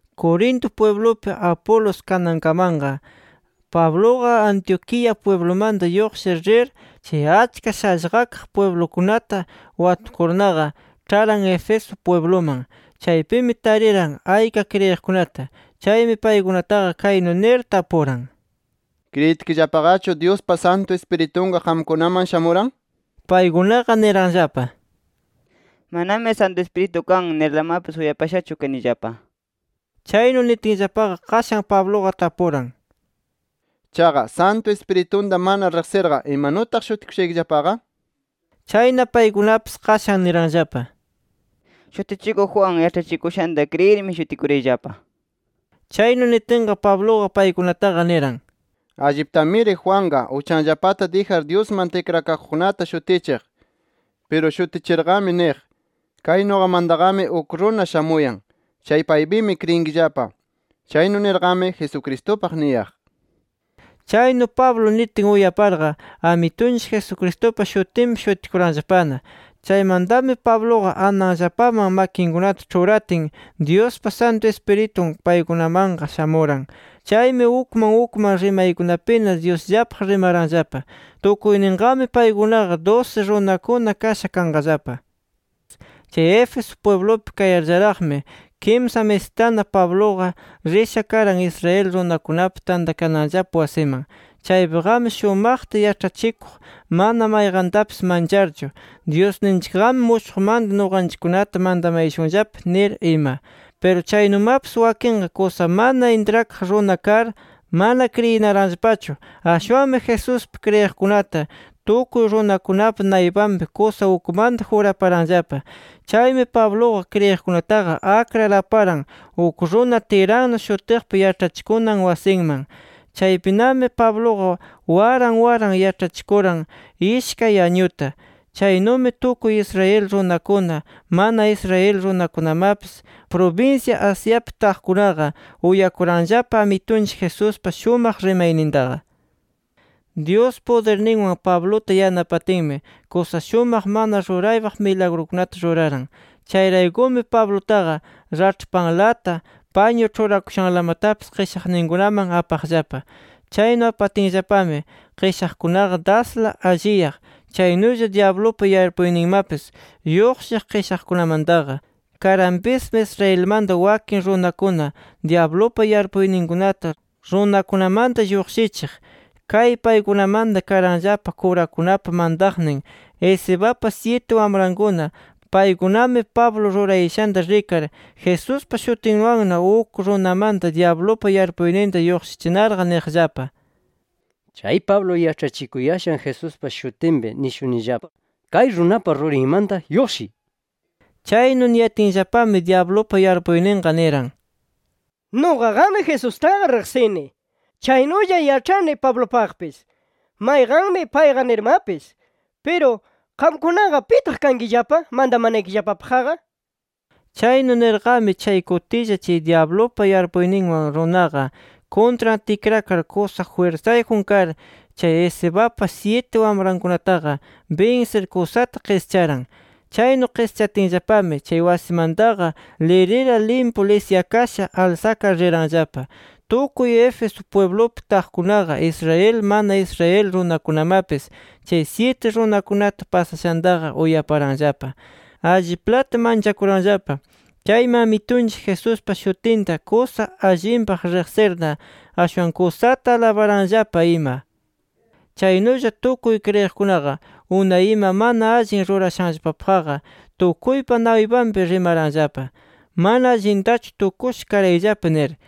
Corinto pwiblupi, Apolos kanankamanqa, Pabluqa Antioquía pwiblumanta lluqshir rir, chay achka shallqakaq pwiblukunata watukurnaqa, ĉharan Éfeso pwibluman. Chaypimi tariran ayka kriyiqkunata. Chaymi paykunataqa kaynu nir tapuran: —¿Kriyitkillapaqachu, Dyuspa Santu Ispiritunqa, qamkunaman shamuran? nir. Paykunaqa niranllapa: —Manami Santu Ispiritu kan nirlamapis uyapashachu kanillapa nir. Chaynu nitinllapaqa, qashan Pabluqa tapuran: —¿Chaqa, Santu Ispiritunta mana riqsirqa, imanutaq shutikushaykillapaqa? nir. Chayna, paykunapis qashan niranllapa: —Shutichikuq Juan yaĉhachikushanta kriyirmi, shutikurayllapa nir. Chaynu nitinqa, Pabluqa paykunataqa niran: —Alliptamiri Juanqa, uchanllapata dijar Dyusman tikrakaqkunataqa shutichiq. Piru shutichirqami niq: Kay nuqamantaqami uk runa shamuyan. Chay paypimi kriyinkillapa. Chaynu nirqami Jesucristupaq niyaq. Chaynu Pablo nitin uyaparqa, Amitunchik Jesucristupa shutinpi shutikuranllapana. Chaymantami Pabluqa ananllapaman makinkunata ĉhuratin, Dyuspa Santu Ispiritun paykunamanqa shamuran. Chaymi ukman ukman rimaykunapina Dyusllapaq rimaranllapa. Tukuyninqami paykunaqa dusi runakuna kasha kanqallapa. Chay Éfeso pwiblupi kayarllaraqmi, kimsa misistana Pabluqa risha karan Israel runakunapa tantakananllapa wasiman. Chaypiqami shumaqta yaĉhachikuq mana mayqantapis mancharchu, “Dyusninchikqami mushuqmanta nuqanchikkunata mantamayashunllapa” nir ima. Piru chaynumapis, wakinqa kusa mana intrakaq runa kar, mana kriyinaranllapachu. Ashwanmi Jesuspi kriyiqkunata tukuy runakunapa naypanpi kusa ukmanta juraparanllapa. Chaymi Pabluqa kriyiqkunataqa akrar, aparan uk runa Tiranno shutiqpa yaĉhachikunan wasinman. Chaypinami Pabluqa waran waran yaĉhachikuran, ishkay añuta. Chaynumi, tukuy Israel runakuna, mana Israel runakunamapis prubinsya Asiapi taqkunaqa, uyakuranllapa Amitunchik Jesuspa shumaq rimaynintaqa. Dyus pudirninwan Pabluta yanapatinmi, kusa shumaq mana ruraypaq milagrukunata ruraran. Chayraykumi Pablupataqa raĉhpanlata, pañu ĉhurakushanlamatapis qishaqninkunaman apaqllapa. Chaynu apatinllapami, qishaqkunaqa dasla alliyaq. Chaynulla dyablupa yarpuyninmapis lluqshiq qishaqkunamantaqa. Karanpismi Israelmanta wakin runakuna dyablupa yarpuyninkunata runakunamanta lluqshichiq. Kay paykunamanta karanllapa kurakunapa mantaqnin Escevapa syiti wamrankuna. Paykunami Pablo rurayashanta rikar, Jesuspa shutinwanna uk runamanta dyablupa yarpuyninta lluqshichinarqa niqllapa: “Chay Pablo yaĉhachikuyashan Jesuspa shutinpi nishunillapa: ¡Kay runapa rurinmanta lluqshiy! nir”. Chaynu niyatinllapami dyablupa yarpuyninqa niran: “Nuqaqami Jesustaqa riqsini. Chaynulla yaĉhani Pablupaqpis, mayqanmi payqa nirmapis. Piru ¿qamkunaqa pitaq kankillapa mantamanaykillapapaqqa?” nir. Chaynu nirqami, chay kutilla chay dyablupa yarpuyninwan runaqa, kuntran tikrakar kusa jwirsayjun kar, chay Escevapa syiti wamrankunataqa binsir kusata qischaran. Chaynu qischatinllapami, chay wasimantaqa lirila limpu lisyakasha alsakar riranllapa. Tukuy Éfeso pwiblupi taqkunaqa, Israel mana Israel runakunamapis chay syiti runakunata pasashanta uyaparllapaqa, alliplata manchakuranllapa. Chaymi, Amitunchik Jesuspa shutinta kusa allinpaq riqsirna, ashwan kusata alabaranllapa ima. Chaynulla tukuy kriyiqkunaqa, unay ima mana allin rurashanllapapaqqa, tukuypa naypanpi rimaranllapa: “Mana allintachu tukusha karayllapa” nir.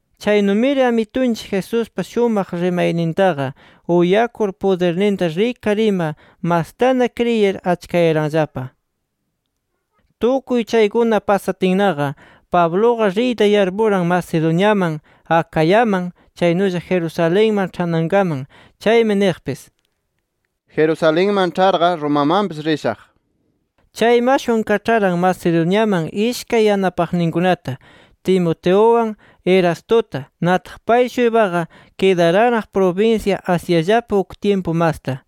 Chaynumiri Amitunchik Jesuspa shumaq rimaynintaqa uyakur, pudirninta rikar ima, mastana kriyir achkayaranllapa. Tukuy chaykuna pasatinnaqa, Pabluqa riyta yarpuran Macedoniaman, Acayaman, chaynulla Jerusalenman ĉhanankaman. Chaymi niqpis: “Jerusalenman ĉharqa, Romamanpis rishaq” nir. Chaymi ashwan kaĉharan Macedoniaman ishkay yanapaqninkunata, Timoteuwan Erastuta. Nataq pay-shuypaqa kidaranraq prubinsya Asiallapi uk tyimpu masta.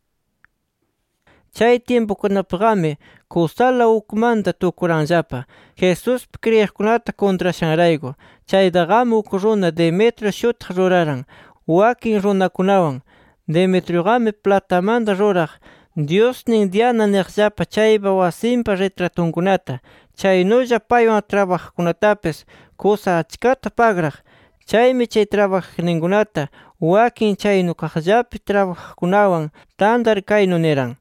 Chay tyimpukunapiqami, kusala ukmanta tukuranllapa Jesuspi kriyiqkunata kuntrashanrayku. Chaytaqami uk runa Demetrio shutiq ruraran wakin runakunawan. Demetriuqami platamanta ruraq, dyusnin Diana niqllapa chaypa wasinpa ritratunkunata. Chaynulla paywan trabajaqkunatapis kusa achkata pagraq. Chaymi chay trabajaqninkunata, wakin chaynukaqllapi trabajaqkunawan tantar, kaynu niran: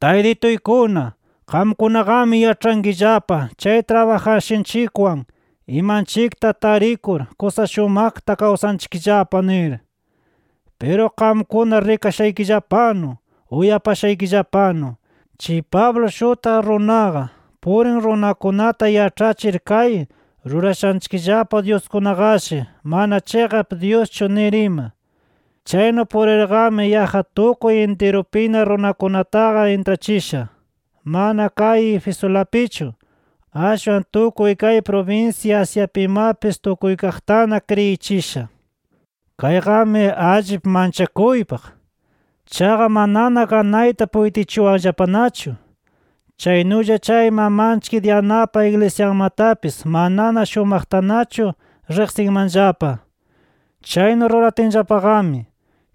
“Taytituykuna, qamkunaqami yaĉhankillapa chay trabajashanchikwan imanchikta tarikur kusa shumaqta kawsanchikllapa nir. Piru qamkuna rikashaykillapanu, uyapashaykillapanu, chay Pablo shutiq runaqa, purin runakunata yaĉhachir kay rurashanchikllapa dyuskunaqashi mana chiqap dyuschu nir ima. Chaynu purirqami yaqqa tukuy intirupina runakunataqa intrachisha, mana kay Efesulapichu. Ashwan tukuy kay prubinsya Asiapimapis tukuykaqtana kriyichisha. Kayqami allip manchakuypaq. Chaqa manana ganayta puytichuwanllapanachu. Chaynulla chay mamanchik Dianapa iglisyanmatapis manana shumaqtanachu riqsinmanllapa. Chaynu ruratinllapaqami,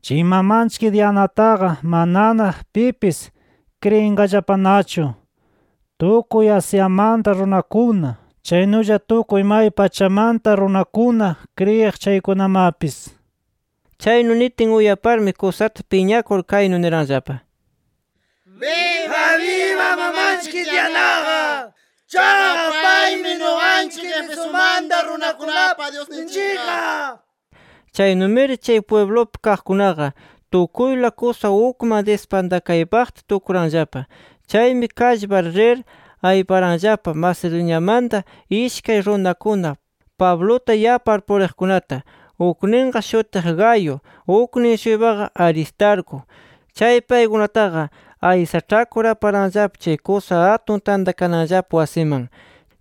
chay mamanchik Dianataqa manana pipis kriyinqallapanachu tukuy Asiamanta runakuna, chaynulla tukuy may pachamanta runakuna kriyiq chaykunamapis”. Chaynu nitin, uyaparmi kusata piñakur kaynu niranllapa: “¡Biba biba mamanchik Dianaqa! ¡Chayqa paymi nuqanchik Efesumanta runakunapa dyusninchikqa!” nir. Chaynumiri chay pwiblupi kaqkunaqa tukuyla kusa ukman dispantakaypaqta tukuranllapa. Chaymi kallpar rir ayparanllapa Macedoniamanta ishkay runakuna, Pabluta yapar puriqkunata. Ukninqa shutiq Gayo, uknin-shuypaqa Aristarco. Chay paykunataqa aysaĉhakur aparanllapa chay kusa atun tantakananllapa wasiman.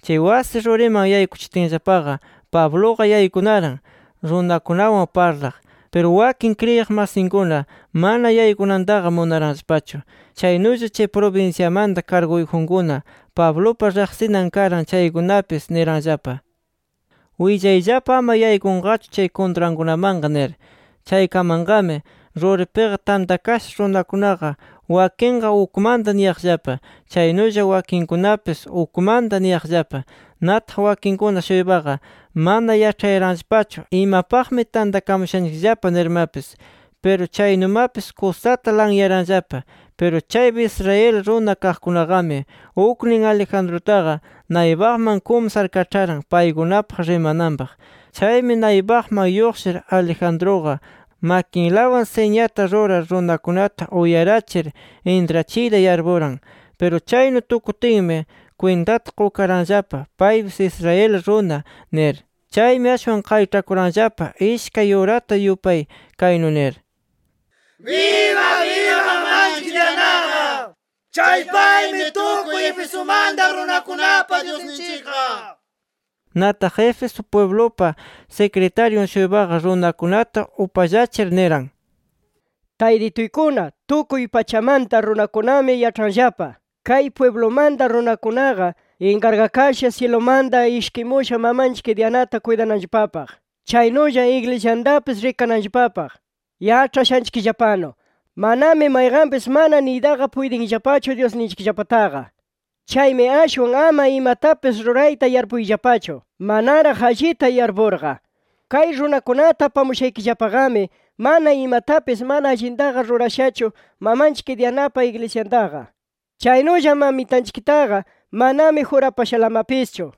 Chay wasi ruriman yaykuchitinllapaqa, Pabluqa yaykunaran runakunawan parlaq. Piru wakin kriyiq masinkuna mana yaykunantaqa munaranllapachu. Chaynulla chay prubinsyamanta karguyjunkuna Pablupa riqsinan karan chaykunapis, niranllapa: “Willayllapa ama yaykunqachu chay kuntrankunamanqa” nir. Chaykamanqami ruripiqa tantakasha runakunaqa, wakinqa ukmanta niyaqllapa. Chaynulla wakinkunapis ukmanta niyaqllapa. Nataq wakinkuna-shuypaqa mana yaĉhayaranllapachu imapaqmi tantakamushanchikllapa nirmapis. Piru chaynumapis kusata lanyaranllapa. Piru chaypi Israel runa kaqkunaqami, uknin Alejandrutaqa naypaqman kumsar kaĉharan paykunapaq rimananpaq. Chaymi naypaqman lluqshir, Alejandruqa makinlawan siñata rurar runakunata uyarachir intrachiyta yarpuran. Piru chaynu tukutinmi, kwintata qukaranllapa paypis Israel runa nir. Chaymi, ashwan qayĉhakuranllapa ishkay urata yupay kaynu nir: “¡Biba biba mamanchik Dianaqa! ¡Chay paymi tukuy Efesumanta runakunapa dyusninchikqa!” nir. Nataq, Éfeso pwiblupa sikritaryun-shuypaqa runakunata upallachir niran: “Taytituykuna, tukuy pachamanta runakunami yaĉhanllapa, kay pwiblumanta runakunaqa inkargakasha syilumanta ishkimusha mamanchik Dianata kuytananllapapaq, chaynulla iglisyantapis rikananllapapaq. Yaĉhashaykillapanu, manami mayqanpis mana niytaqa puytinllapachu dyusninchikllapataqa. Chaymi ashwan ama imatapis rurayta yarpuyllapachu, manaraq allita yarpurqa. Kay runakunata apamushaykillapaqami, mana imatapis mana allintaqa rurashachu mamanchik Dianapa iglisyantaqa. Chaynulla mamitanchiktaqa manami jurapashalamapischu.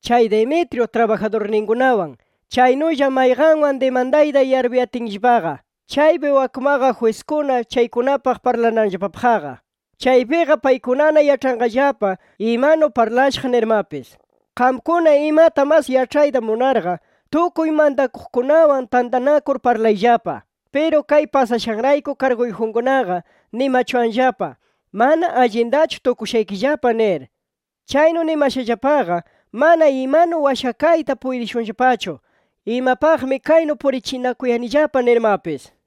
Chay Demetrio trabajadurninkunawan, chaynulla mayqanwan dimandayta yarpuyatinllapaqa, chaypi wakmaqa jwiskuna chaykunapaq parlananllapapaqqa. Chaypiqa paykunana yaĉhanqallapa imanu parlashaq nirmapis. Qamkuna imata mas yaĉhayta munarqa tukuy mantakuqkunawan tantanakur parlayllapa. Piru kay pasashanrayku karguyjunkunaqa nimachuwanllapa mana allintachu tukushaykillapa nir. Chaynu nimashallapaqa mana imanu washakayta puytishunllapachu, imapaqmi kaynu purichinakuyanillapa nirmapis”.